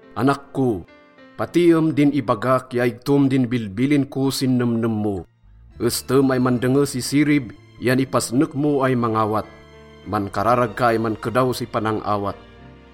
Anak ko, patiem din ibagak ya igtom din bilbilin ko sin nemnem mo. Estem ay mandenge si sirib yan ipasnek mo ay mangawat. Mankararag ka ay mankedaw si panang-awat.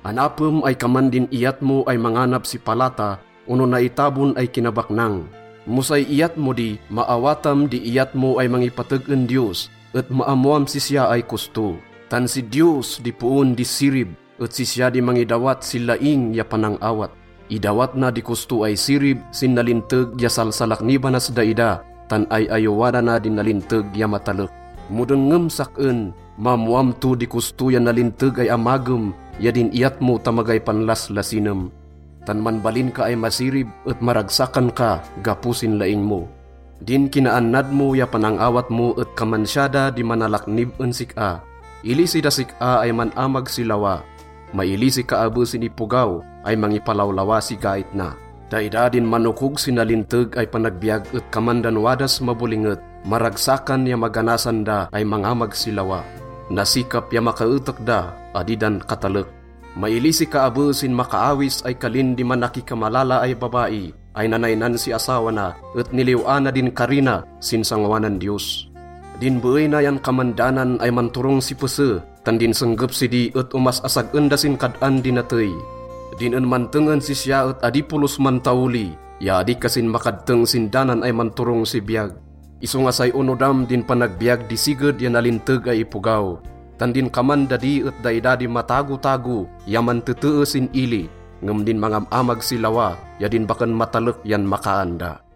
Anapem ay kaman din iyat mo ay manganap si palata ono naitabon ay kinabaknang. Mo say iyat mo di, maawatam di iyat mo ay mangipateg en Diyos et maammoam sisya ay kosto. Tan si Diyos di poon di sirib et sisya di mangidawat si laing ya panang-awat. Idawat na di kosto ay sirib sin nalinteg ya salsalaknibanas daida tan ay-ayowanana din nalinteg ya matalek. Mo dengngem sak-en, maammoam to di kosto ya nalinteg ay amagem ya din iyat mo ta magay panlaslasinem. Tan manbalin ka ay masirib et maragsakan ka gapo sin laing mo. Din kinaannad mo ya panang-awat mo et kaman siya da di manalaknib en sik-a. Ilisi das sik-a ay man-amag si lawa. Mailisi ka abe sin ipogaw ay mangipalawlawa si gait na. Daida din manokog si nalinteg ay panagbiyag et kaman dan wadas mabolinget. Maragsakan ya maganasan da ay mangamag si lawa. Nasikap ya makaetek da, adi dan katalek. Mailisi ka abe sin makaawis ay kalin di manakikamalala ay babai ay nanaynan si asawa na et niliw-ana din kari na sin sangoanan Diyos. Din beey na yan kaman danan ay manturong si pese, tan din senggep sidi et omas-asag-en da sin kad-an di natey. Din en manteng en sisya et adi polos mantaoli ya adi kasin makadteng sin danan ay manturong si biyag. Isonga say onodam din panagbiyag di siged ya nalinteg ay ipogaw. Tan din kaman dadi et daida di matagotago ya mantetee sin ili, ngem din mangam-amag si lawa ya din baken matalek yan makaan da.